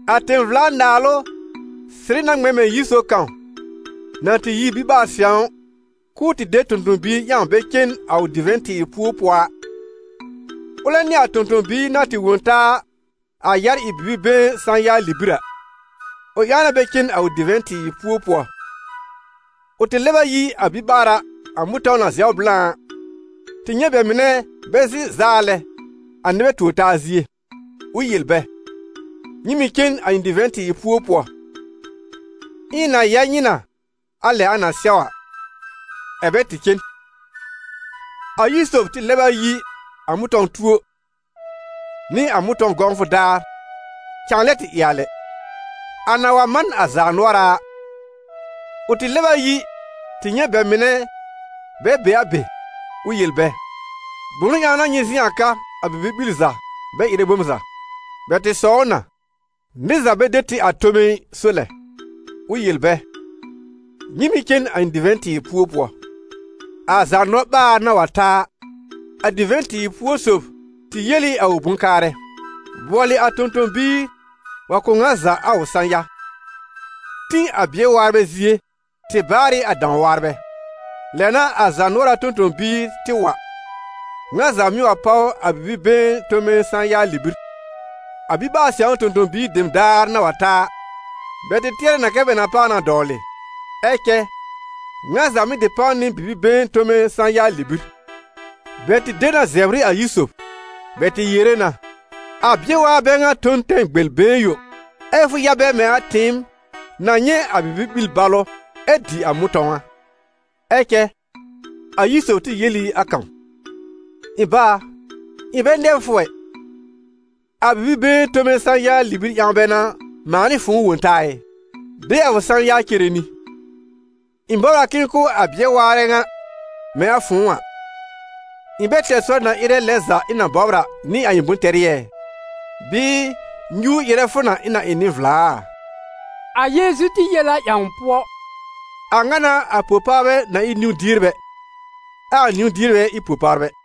«A tẽ-vla-naalʋ sɩrɩ na ŋmɛ̃ mɛ̃ yir sob kãw na tɩ yi biɓaar-sɛ̃w, k'ʋʋ tɩ de tõ-tõ-biir ƴãw bɛ cen a ʋ divɛ̃-tɩɩr púo pʋɔ a. Ʋlɛ nɩ a tõ-tõ-biir na tɩ wõ taa a yar ɩ bibi-been sã-ya libir a, ʋ ƴãw na bɛ cen a ʋ divɛ̃-tɩɩr púo pʋɔ. Ʋ tɩ lɛb a yi a biɓaara, a mʋ̃tɔ̃w na zɛw blã a, tɩ nyɛ̃ bɛ mɩnɛ bɛ zɩ̃ zaa lɛ a nɩbɛ tuor-taa zie. Ʋ yel bɛ: ‹Nyɩ mɩ̀ cen a ɩ̃ divɛ̃-tɩɩr púo pʋɔ, ɛ ɩ̃ na ya nyɩ nɩ a lɛ a na sɛw a.› Ɛ̀ bɛ tɩ cen. A yir sob tɩ lɛb a yi a mʋ̃tɔ̃-tuo nɩ a mʋ̃tɔ̃w gɔ̃wfʋ daar cãa lɛ tɩ ɩ a lɛ. A na wa man a zaanʋɔra a, ʋ tɩ lɛb a yi tɩ nyɛ̃ bɛ mɩnɛ bɛ be a be, ʋ yel bɛ: ‹Bʋnʋ ƴãw n'a nyɩ zɩ̃ a ka a bibi-ɓil za bɛ ɩrɛ bom za?› Bɛ tɩ sɔw ʋ na: ‹Nɩr za bɛ de tɩ a tome ɩ, so lɛ.› Ʋ yel bɛ: ‹Nyɩ mɩ̀ cen a ɩ̃ divɛ̃-tɩɩr púo pʋɔ.› A zaanɔ-ɓaar na wa ta a, a divɛ̃-tɩɩr púo sob tɩ yel ɩ a ʋ bʋ̃-kaarɛ: ‹Bʋɔlɩ a tõ-tõ-biir wa kʋ̀ ŋa za a ʋ sã-ya. Tĩ a bɩɛr-waarbɛ zie tɩ baar ɩ a dãw-waarbɛ.› Lɛ n'a a zaanʋɔra tõ-tõ-biir tɩ wa, ŋa za mɩ́ wa páw a bibi-been tome sã-ya libir. A biɓaar-sɛ̃w tõ-tõ-biir dem daar na wa ta a, bɛ tɩ tɩɛrɛ na kɛ bɛ na páw na dɔwlɩ, ɛ cɛ ŋa za mɩ̀ tɩ páw nɩ bibi-been tome sã-ya libir. Bɛ tɩ de na zɛbr ɩ a yir sob. Bɛ tɩ yere na: ‹A bɩɛr-waarbɛ bɛ ŋa tõ n tɛm gbel-been yõ, ɛ fʋ ya bɛ mɛ̃ a tɩɩm na nyɛ̃ a bibi-ɓil balʋ ɛ dɩ a mʋ̃tɔ̃w a!› Ɛ cɛ a yir sob tɩ yel ɩ a kãw: ‹Ɩ̃ bá a, ɩ̃ bɛ nɛbr fʋ ɛ, a bibi-been tome sã-ya libir ƴãw bɛ n'a mãa nɩ fʋ̃ʋ wõ taa ɩ? De a fʋ sã-ya cere nɩ. Ɩ̃ bɔbr a k'ɩ̃ɩ kʋ̀ a bɩɛr-waarɛ ŋa mɛ̃ a fʋ̃ʋ a. Ɩ̃ bɛ tɛr sɔr na ɩrɛ lɛn za ɩ̃ na bɔbr a nɩ a ɩ̃ bʋ̃-tɛrɩ ɛ? Bɩɩ nyuur ɩrɛ fʋ na ɩ̃ na ɩ nɩ-vla a?›» A Yeezu tɩ yel a ƴãw pʋɔ: «A ŋa n'a a po-pawrbɛ na ɩ niwn-dierbɛ, ɛ a niwn-dierbɛ ɩ po-pawrbɛ.»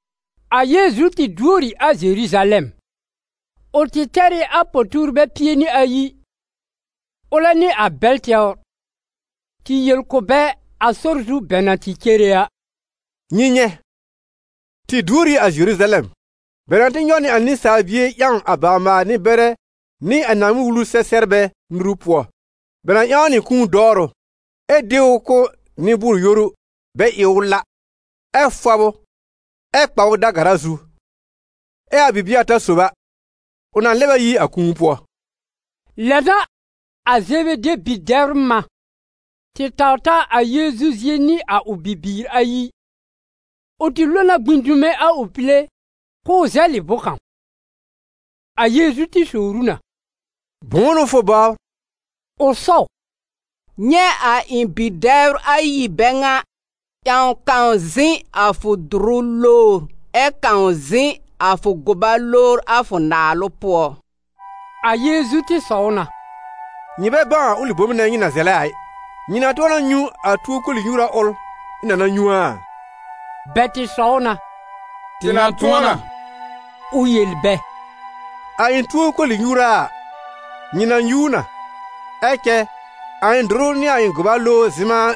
A Yeezu tɩ duor ɩ a Zeruzalɛm. Ʋ tɩ tɛr ɩ a po-tuurbɛ pie nɩ ayi, ʋlɛ nɩ a bɛl tɛwr, tɩ yel kʋ̀ bɛ a sɔr zu bɛ na tɩ cere a: «Nyɩ nyɛ̃, tɩ duor ɩ a Zeruzalɛm, bɛ na tɩ nyɔw nɩ a Nɩsaal Bie ƴãw a bawr-maal-nɩ-bɛrɛ nɩ a Naaŋmɩn-Wulu sɛ-sɛbrbɛ nuru pʋɔ, bɛ na ƴãw ʋ nɩ kũu dɔwrʋ, ɛ de ʋ kʋ̀ nɩ-bʋʋr-yoru bɛ ɩ ʋ la, ɛ fɔb ʋ, ɛ kpa ʋ da-gara zu, ɛ a bibie ata sob a, ʋ na lɛb a yi a kũu pʋɔ.» Lɛ n'a a Zebede bi-dɛbr mã, tɩ taw ta a Yeezu zie nɩ a ʋ bibiir ayi; ʋ tɩ lo na gbĩ dume a ʋ pile k'ʋʋ zɛlɩ bʋ̃-kãw. A Yeezu tɩ sowr ʋ na: «Bʋ̃ʋ n'ʋ fʋ bɔbr?» Ʋ sɔw: «Nyɛ̃ a ɩ̃ bi-dɛbr ayi bɛ ŋa, ƴãw kãw zɩ̃ a fʋ dʋrʋ lowr ɛ kãw zɩ̃ a fʋ gʋba lowr a fʋ naalʋ pʋɔ.» A Yeezu tɩ sɔw na: «Nyɩ bɛ bãw a ʋlɩ bom nɛ nyɩ na zɛlɛ a ɩ. Nyɩ na tʋ̃ɔ na nyũ a tuo koli-nyuura ʋl ɩ̃ na na nyũ a?» Bɛ tɩ sɔw na: «Tɩ na tʋ̃ɔ na.» Ʋ yel bɛ: «A ɩ̃ tuo koli-nyuura a, nyɩ na nyũ ʋ na. Ɛ cɛ a ɩ̃ dʋrʋ nɩ a ɩ̃ gʋba lowr zɩ̃ma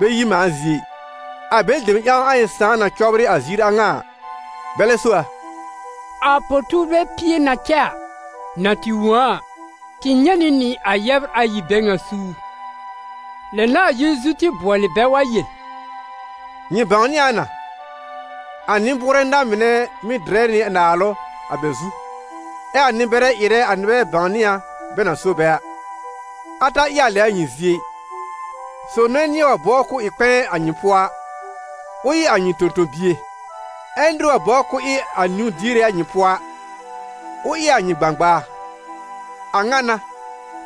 bɛ yi mãa zie ɩ, a bɛlɩ dem ƴãw a ɩ̃ Sãà na cɔbrɩ a ziir a ŋa a, bɛlɛ so a.» A po-tuurbɛ pie na cɛ a, na tɩ wõ a a, tɩ nyɛ̃ nɩ nɩ a yɛbr ayi bɛ ŋa suur. Lɛ n'a a Yeezu tɩ bʋɔlɩ bɛ wa yel: «Nyɩ bãwnɩ a na, a nɩ-bʋʋrɛ na-mɩnɛ mɩ́ dɩrɛ nɩ naalʋ a bɛ zu, ɛ a nɩ-bɛrɛ ɩrɛ a nɩbɛ bãwnɩ a bɛ na so bɛ a. A ta ɩ a lɛ a nyɩ zie ɩ. Sob nɛ nɩ̃ɛ wa bɔbr k'ʋʋ ɩ kpɛ̃ɛ a nyɩ pʋɔ a, ʋ ɩ a nyɩ tõ-tõ-bie, ɛ nɩr wa bɔbr k'ʋʋ ɩ a niwn-diere a nyɩ pʋɔ a, ʋ ɩ a nyɩ gbãgbaa. A ŋa n'a,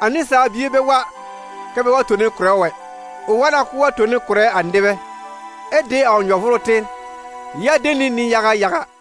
a Nɩsaal Bie bɛ wa kɛ bɛ wa tone kʋ̀rɛ ʋ ɛ, ʋ wa na k'ʋʋ wa tone kʋ̀rɛ a nɩbɛ, ɛ de a ʋ nyɔ-vʋʋrʋ tɩr ya de nɩ nɩ-yaga yaga.»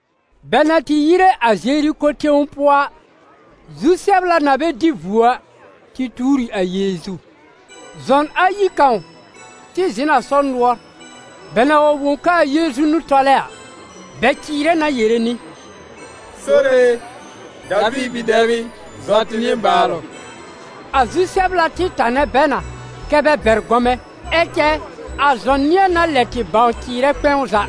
Bɛ na tɩ yire a Zeriko tẽw pʋɔ a, zu-sɛbla na bɛ dɩ vuo a, tɩ tuur ɩ a Yeezu. Zɔn ayi kãw tɩ zɩ̃ n a sɔr nʋɔr. Bɛ na wa wõ k'aa Yeezu n'ʋ tɔlɛ a, bɛ cɩɩrɛ na yere nɩ: «Sore e, Daviir bi-dɛb ɩ, zɔ tɩ nɩbaalʋ!» A zu-sɛbla tɩ tanɛ bɛ na kɛ bɛ bɛr gɔmɛ̃. Ɛ cɛ a zɔn nɩ̃ɛ na lɛ tɩ bãw cɩɩrɛ kpɛ̃w za: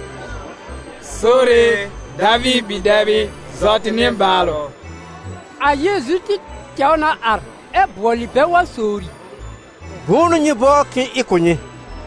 «Sore e, Daviir bi-dɛb ɩ, zɔ tɩ nɩbaalʋ!» A Yeezu tɩ tɛw na ar ɛ bʋɔlɩ bɛ wa sowri: «Bʋ̃ʋ n'ʋ nyɩ bɔbr k'ɩ̃ɩ ɩ kʋ̀ nyɩ?»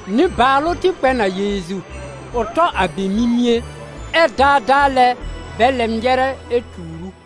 Nɩbaalʋ tɩ kpɛ n a Yeezu, ʋ tɔ a bɛ mimie, ɛ daadaa lɛ bɛ lɛb nyɛrɛ, ɛ tuur ʋ.